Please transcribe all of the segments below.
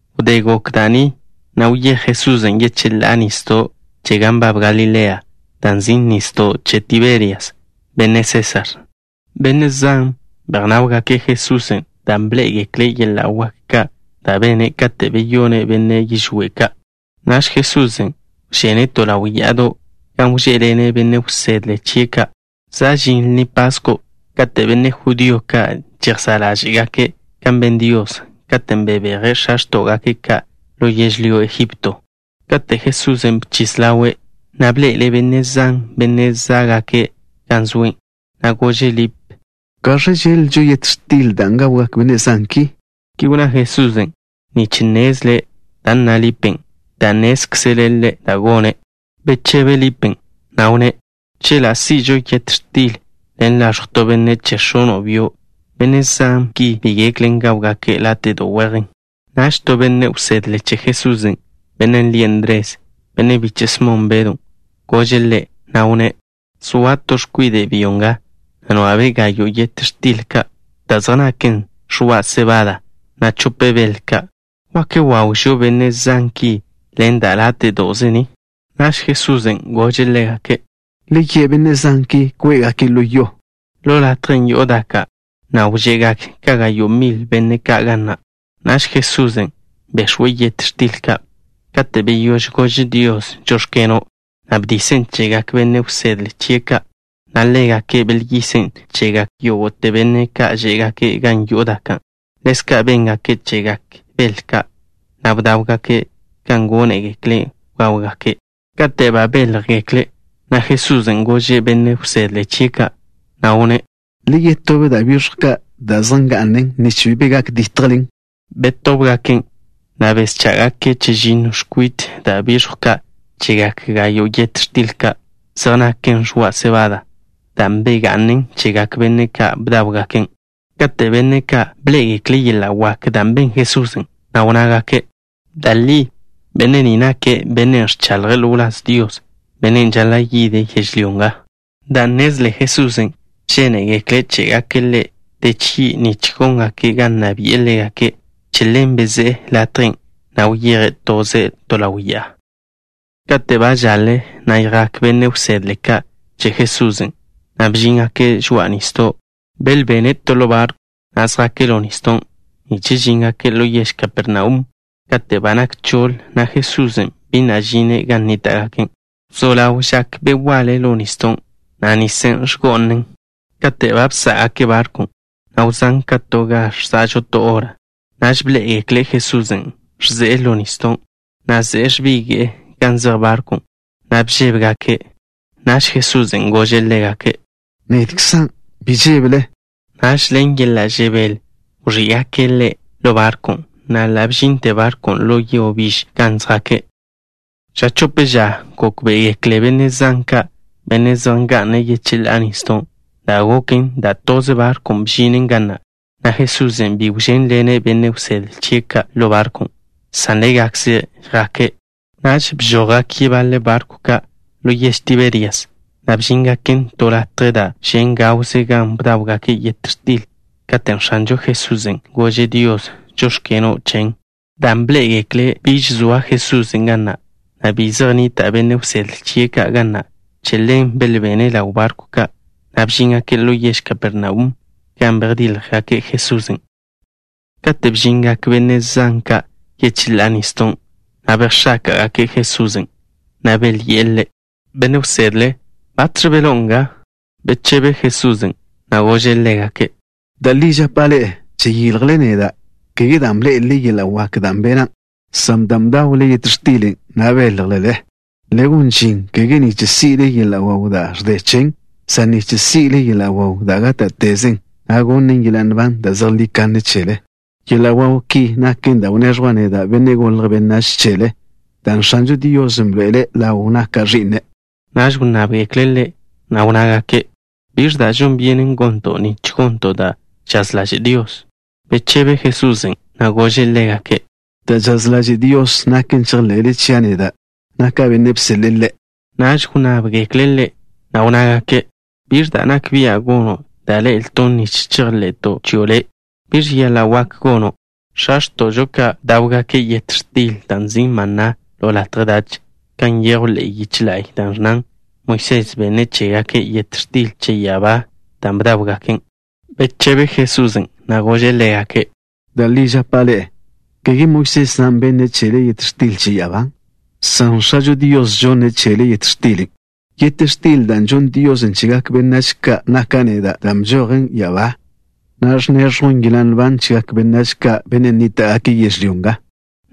Wdé gok da' ni, wyéj Jesusen' yecheḻá'a nisdo' che gan nbab Galilea, dan' nzin' Nisdo' Che Tiberias, benne' Sésar. Benne' zan bejnáwgake' Jesusen' dan' bḻé'egekle' yeḻa' wak ka' da' bene', katen' beyone' benne' yižwé' ka'. Naž Jesusen' wžene' to ḻaw ya'ado', gan wžé'ḻene' benne' wsedle chie' ka'. Za' žin Lni Pasko' kate' benne' judío ka' žejsá' ḻáže'gake' kan ben Dios, katen' bebeje' x̱a x̱tó'gake' ka' ḻo yežlyó Egipto. Kate' Jesusen' bchis ḻawe', bḻe'ele' benne' zan, benne' zá'gake' gan zoe', na' gože' Lip: —¿Gaẕ žeḻ-lžo yet x̱til dan' gawgak benne' zan ki? Ki wnná Jesusen' nich nnezle' da' nna Lipen', dan' nnézkzele' Ḻe' da' gone'. Bechebe Lipen', na' wnné': —Chela' si'žo yet x̱til ḻen laẕjw to benne' che x̱ono' byo', benne' zan ki bi geklen gáwgake' láte'do' wejen. Naž to benne' wsedle che Jesusen', bennen' lie' Ndres, benne' biche' Smon Bedw, gože' Ḻe', na' wnné': —Zoa to x̱kwide' byo nga, nwa'be' gayo' yet x̱til ka' da' zej naken ẕoa' sebada, na' chope bel ka'. ¿Wak wawžo benne' zan ki ḻen da' láte'do'ze ni? Naž Jesusen' gože' ḻégake': —Le ye' benne' zan ki kwé'gake' ḻo yo. Ḻo latjen' yo'o daka', na' wže'gak ka gayo' mil benne' ka' ga na'. Naž Jesusen' bex̱we' yet x̱til ka'. Kate' beyóž gože' Dios “Žóx̱keno'” bdisen' chegak benne' wsedle chie' ka', na' ḻégake' belyisen' chegak yógo'te benne' ka' žé'gake' gan yo'o daka'. Ḻezka' béngake' chegak bel ka', na' bdáwgake' kan gónegekle' gáwgake'. Kate' ba béljegekle', Jesusen' gože' benne' wsedle chie' ka', na' wnné': —Le yetób da' biẕjw ka' da' zej nga'nen, nich bi be nitlen. Betóbgaken', na' beschá'gake' chežinno x̱kwit da' biẕjw ka' chegak gayo' yet x̱til ka' zej naken ẕoa' sebada, dan' bega'nen chegak benne' ka' bdáwgaken'. Kate' benne' ka' bḻé'egekle' yeḻa' wak dan' ben Jesusen', na' wnnágake': —Da' li benne' ni nake' Bennen' ẕchaḻje' ḻo wláz Dios, Bennen' žaḻa' yide' yežlyó nga. Dan' nnezle Jesusen' žénegekle' ché'gake' Ḻe' de chgi' nich góngake' ga nna bi'e ḻégake', che ḻen bezé'e latjen', na' wyeje' toze' to ḻaw ya'a. Kate' ba žaḻe, jak benne' wsedle ka' che Jesusen', na' bžíngake' žoa'a nisdo'. Belbene' to ḻo barkw, na' zjake' ḻo nisdon', nich žíngake' ḻo yež Kapernaum. Kate' ba nak choḻ, Jesusen' bi na' žine' gan nníta'gake'. Wzó ḻaw žak be' waḻe ḻo nisdon', na' nisen' ẕgó'anen. Kate' ba bsá'gake' barkwn', na' wzán' ka to ga ẕza'žo to hora, naž bḻé'egekle' Jesusen' ẕze'e ḻo nisdon', na' ze'e ẕbige'e gan zej barkwn', na' bžébegake'. Naž Jesusen' gože' ḻégake': —Nedkzan'. Bi žébele. Naž ḻen yeḻa' žebél wẕí'gake' Ḻe' ḻo barkwn', na' ḻa' bžinte barkwn' ḻo yo biž gan zjake'. Ža chope ža, gókbe'egekle benne' zan ka', benne' zej nga'ne' yecheḻá'a nisdon', da' goken, dan' toze barkw bžinen ga na', na' Jesusen' bi wžénḻene' benne' wsedle chie' ka' ḻo barkwn', san ḻégakze' jake'. Naž bžojgak yebaḻe barkw ka' ḻo yež Tiberias, na' bžíngaken to latje da' žen' gawze gan bdáwgake' yet x̱til, katen' X̱anžo Jesusen' gože' Dios: “Žóx̱keno'” chen. Dan' bḻé'egekle' biž zoa Jesusen' ga na', na' bi zej nnita' benne' wsedle chie' ka' ga na', che ḻen belbene' ḻaw barkw ka', na' bžíngake' ḻo yež Kapernaum, gan bejdíljgake' Jesusen'. Kate' bžingak benne' zan ka' yecheḻá'a nisdon', bejx̱áka'gake' Jesusen', na' belyi'e Ḻe': —Benne' wsedle, ¿batx̱ beḻó'o nga? Bechebe Jesusen', na' gože' ḻégake': —Da' li žapa' ḻe'e: žeyiljle neda', kege dan' bḻé'elele yeḻa' wak ka' da' bena', san dan' bdawle yet xtilen', na' béljelele. Le gon žin, kege nich si'le yeḻa' waw da' ẕde chen, san nich si'le yeḻa' waw da' gáta'tezen, na' gonnen yeḻa' nban da' zejlí kanne chele. Yeḻa' waw ki naken da' wneẕjwa' neda', Benne' Golje' Benách, chele, dan' X̱ažo Dios bḻoe'ele' ḻaw naka' Ẕi'ne'. Naž wnnábgekle' Ḻe', na' wnnágake': —¿Biẕ da' žon byenen gonto' nich gonto' da' žaz ḻaže' Dios? Bechebe Jesusen', na' gože' ḻégake': —Da' žaz ḻaže' Dios naken chejḻe'le chia' neda', naka' Bennen' bseḻe'e Ḻe'. Naž wnnábgekle' Ḻe', na' wnnágake': —¿Biẕ da' nak bia' gono', da' ḻe'elton' nich chejḻe'to' chio' Le'? ¿Biẕ yeḻa' wak gono'? X̱a gole chežo ka' bdáwgake' yet x̱til da' nzin' maná ḻo latje dach, kan nyejw ḻe'e yiche la'y, da' ẕnnan: “Moisés benne' chégake' yet x̱til che ya'abá, dan' bdáwgaken'.” Bechebe Jesusen', na' gože' ḻégake': —Da' li žapa' ḻe'e: kege Moisés na' benne' chele yet x̱til che ya'abá, san X̱ažo Dios žonne' chele yet x̱tilen'. Yet x̱til dan' žonn Dios chegak benách ka' naka' neda', dan' bžojen ya'abá, na' ẕneẕjwn yeḻa' nban chegak benách ka', benne' nníta'gake' yežlyó nga.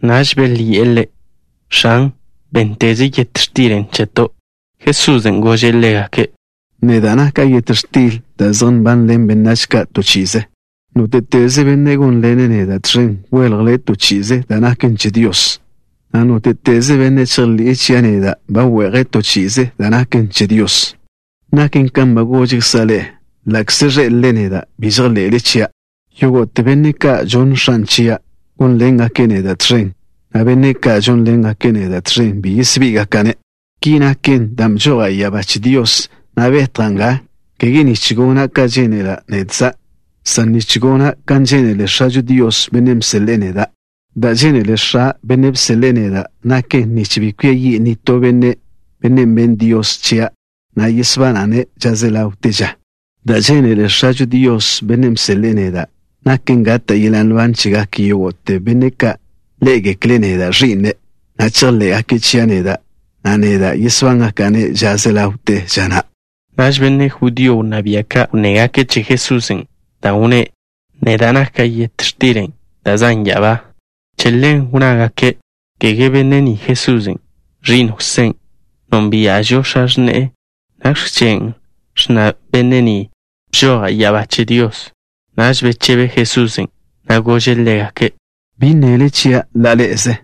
Naž belyi'e Ḻe': —X̱an, bénnteze yet x̱tilen' cheto'. Jesusen' gože' ḻégake': —Neda' naka' yet x̱til da' zej nbanḻen benách ka' to chi'ize. Nóte'teze benne' gónḻene' neda' tẕen, wéljele' to chi'ize da' naken che Dios, na' nóte'teze benne' chejḻi'e chia' neda', ba we'je' to chi'ize da' naken che Dios. Naken kan ba gožkza' ḻe'e, ḻa'kze ẕḻé'elele neda', bi žejḻe'le chia'. Yógo'te benne' ka' žonn X̱a' chia', gónḻengake' neda' tẕen, na' benne' ka' gónḻengake' neda' tẕen, bi yesbí'igaka'-ne'. Ki naken dan' bžoja' ya'abá che Dios, na' betja' nga, kege nich gona' kan žénela' nedkza', san nich gona' kan žénele X̱ažo Dios, Bennen' bseḻe'e neda'. Da' žénele X̱a', Bennen' bseḻe'e neda', naken bi kwia yi' nitó benne', bennen' benn Dios chia', na' yesbana'-ne' ža ze ḻawte ža. Da' žénele X̱ažo Dios, Bennen' bseḻe'e neda', naken gata' yeḻa' nban chegak yógo'te benne' ka' ḻé'egekle' neda', Ẕi'ne', na' chejḻé'gake' chia' neda', na' neda' yesbángaka'-ne' ža ze ḻawte ža na'. Naž benne' judío wnná bia' ka' wnnégake' che Jesusen', dan' wnné': “Neda' naka' yet x̱tilen' da' zan' ya'abá.” Che ḻen wnnágake': —¿Kege benne' ni Jesusen', ẕi'n Jwsé? Nónbia'žo x̱a x̱ne'e. ¿Nakx̱ chen', ẕnna benne' ni: “Bžoja' ya'abá che Dios?” Naž bechebe Jesusen', na' gože' ḻégake': —Bi nnele chia' ḻa' ḻe'eze.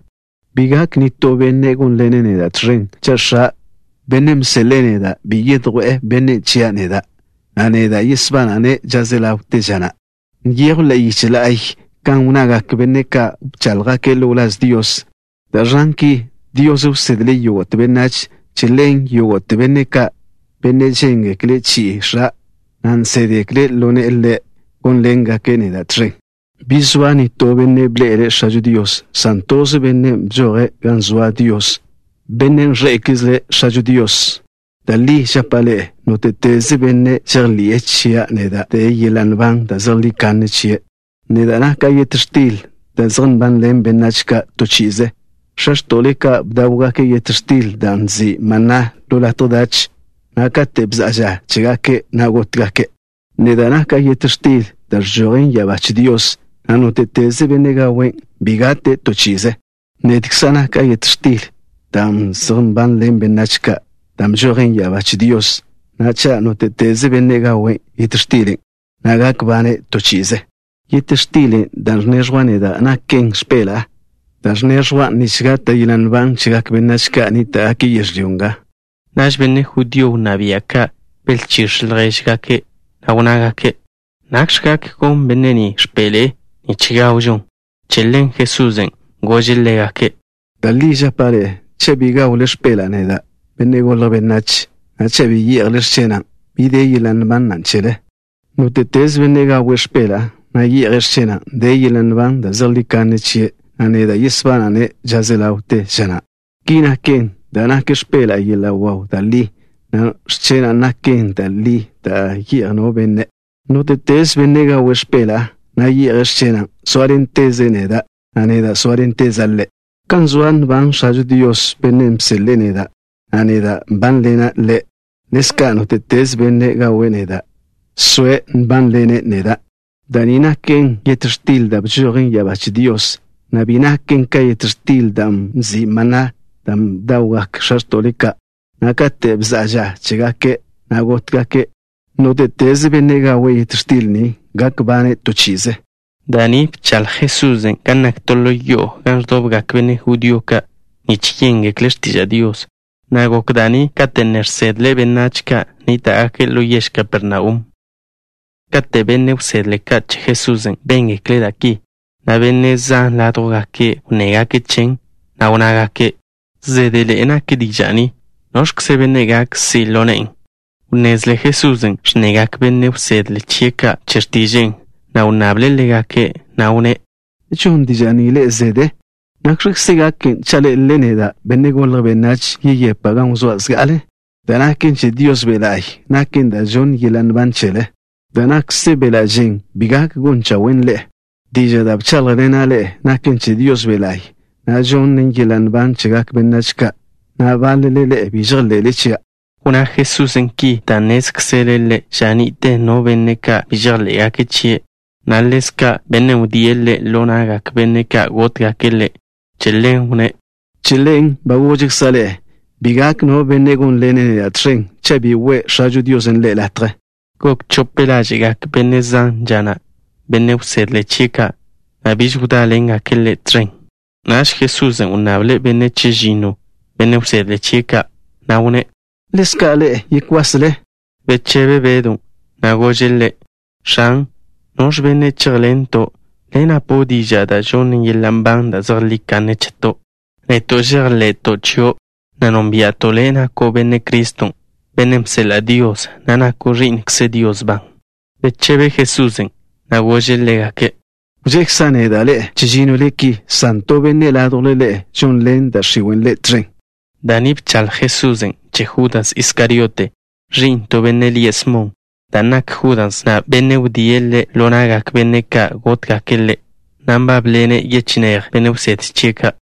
Bi gak nitó benne' gónḻene' neda' tẕen, cha' X̱a', Bennen' bseḻe'e neda', bi yedjwé'e bennen' chia' neda', na' neda' yesbana'-ne' ža ze ḻawte ža na'. Nyejw ḻe'e yiche la'y kan wnnagak benne' ka' bcháḻjgake' ḻo wláz Dios, da' ẕnnan ki: “Dios wsedle' yógo'te benách.” Che ḻen, yógo'te benne' ka', benne' želyenle' chi'i X̱a', na' nsédgekle' ḻo ne'e Ḻe', gónḻengake' neda' tẕen. ’Bi zoa no benne' bḻe'ele' X̱ažo Dios, san toze Bennen' bžoje' gan zoa Dios. Bennen' ẕḻe'ekzle' X̱ažo Dios. Da' li žapa' ḻe'e: nóte'teze benne' žejḻi'e chia' neda' de yeḻa' nban da' zejlí kanne chie'. Neda' naka' yet x̱til da' zej nbanḻen benách ka' to chi'ize. X̱a x̱to'le ka' bdáwgake' yet x̱tilen' dan' nzin' maná ḻo latje dach, na' kate' bza'a ža chégake', gótgake'. Neda' naka' yet x̱til da' ẕžojen ya'abá che Dios, na' nóte'teze benne' gawen', bi gate' to chi'ize. Nedkza' naka' yet x̱tilen' da' zej nbanḻen benách ka', dan' bžojen ya'abá che Dios, na' cha' nóte'teze benne' gawe' yet xtilen', na' gak bane' to chi'ize. Yet x̱tilen' da' ẕneẕjwa' neda' naken x̱peḻa'a, da' ẕneẕjwan' nich gata' yeḻa' nban chegak benách ka' nníta'gake' yežlyó nga. Naž benne' judío wnná bia' ka' belchíx̱ ljéžgake', na' wnnágake': —¿Nakx̱ gak gonn benne' ni x̱peḻe'e nich gawžon? Che ḻen Jesusen' gože' ḻégake': —Da' li žapa' ḻe'e: cha' bi gawle x̱peḻa'a neda', Benne' Golje' Benách, na' cha' bi ye'jle x̱chena', bi de yeḻa' nban na' chele. Nóte'teze benne' gawe' x̱peḻa'a, na' ye'je' x̱chena', de yeḻa' nban da' zejlí kanne chie', na' neda' yesbana'-ne' ža ze ḻawte ža na'. Ki naken dan' nak x̱peḻa'a yeḻa' waw da' li, na' x̱chena' naken to da' li da' ye'jen no benne'. Nóte'teze benne' gawe' x̱peḻa'a, na' ye'je' x̱chena', sóaḻenteze' neda', na' neda' sóaḻenteza' ḻe'. Kan zoa nban X̱ažo Dios, Bennen' bseḻe'e neda', na' neda' nbánḻena' Ḻe', ḻezka' nóte'teze benne' gawe' neda', soe' nbánḻene' neda'. Da' ni naken yet x̱til da' bžojen ya'abá che Dios, na' bi naken ka yet x̱tilen' dan' nzin' maná, dan' bdawgak x̱a x̱to'le ka', na' kate' bza'a ža chégake', gótgake'. Nóte'teze benne' gawe' yet x̱til ni gak bane' to chi'ize. Da' ni bchaḻj Jesusen' gan nak to ḻo yo'o gan ẕdobgak benne' judío ka' nich yéngekle' x̱tiža' Dios, na' gok da' ni kate' ne žsedle' benách ka' nníta'gake' ḻo yež Kapernaum. Kate' benne' wsedle ka' che Jesusen' béngekle' da' ki, benne' zan ládjwgake' wnnégake' chen, na' wnnágake': —Zédeḻe'e nak diža' ni. ¿Noẕkze benne' gak si' ḻo ne'en? Wnnezle Jesusen' ẕnnegak benne' wsedle chie' ka' che x̱tiže'e, na' wnnable' ḻégake', na' wnné': —¿Žon diža' ni ḻe'e zede? ¿Nakx̱kze gaken cha' ḻé'elele neda', Benne' Golje' Benách, yeyepa' gan wzóa' zga'ale? Da' nak che Dios Be' La'y naken da' žonnen yeḻa' nban chele. Da' nakze beḻa' žen bi gak gon chawen' ḻe'e. Diža' da' bcháḻjḻena' ḻe'e naken che Dios Be' La'y, na' žonnen yeḻa' nban chegak benách ka'. Na'a, báḻele ḻe'e bi žejḻe'le chia'. Wnná Jesusen' ki dan' nnézkzele' Ḻe' ža ni'te no benne' ka' bi žejḻé'gake' chie', na' ḻezka' bennen' wdíe' Ḻe' ḻo na'gak benne' ka' gótgake' Ḻe'. Che ḻen wnné': —Che ḻen ba gožkza' ḻe'e bi gak no benne' gónḻene' neda' tẕen, cha' bi we' X̱ažo Dios ḻe' latje. Gok chope ḻáže'gak benne' zan ža na', benne' wsedle chie' ka', na' biž wdáḻengake' Ḻe' tẕen. Naž Jesusen' wnnable' benne' chežinno, benne' wsedle chie' ka', na' wnné': —¿Ḻezka' ḻe'e yekwasle? Bechebe Bedw, na' gože' Ḻe': —X̱an, ¿noẕ benne' chéjḻento'? Le' napo' diža' da' žonnen yeḻa' nban da' zejlí kanne cheto'. Neto' žejḻe'to' chio', na' nónbia'to' Le', nako' Benne' Criston', Bennen' bseḻa' Dios, na' nako' Ẕi'nkze Dios ban. Bechebe Jesusen', na' gože' ḻégake': —Wžekza' neda' ḻe'e chežínnole ki, san to benne' ládjwle ḻe'e žonḻen da' x̱iwe' ḻe' tẕen. Da' ni bchaḻj Jesusen' che Judas Iskariote, ẕi'n to benne' lie' Smon, dan' nak Judas na' bennen' wdíe' Ḻe' ḻo na'gak benne' ka' gótgake' Ḻe', na' nbábḻene' yechinéj benne' wsedle chie' ka'.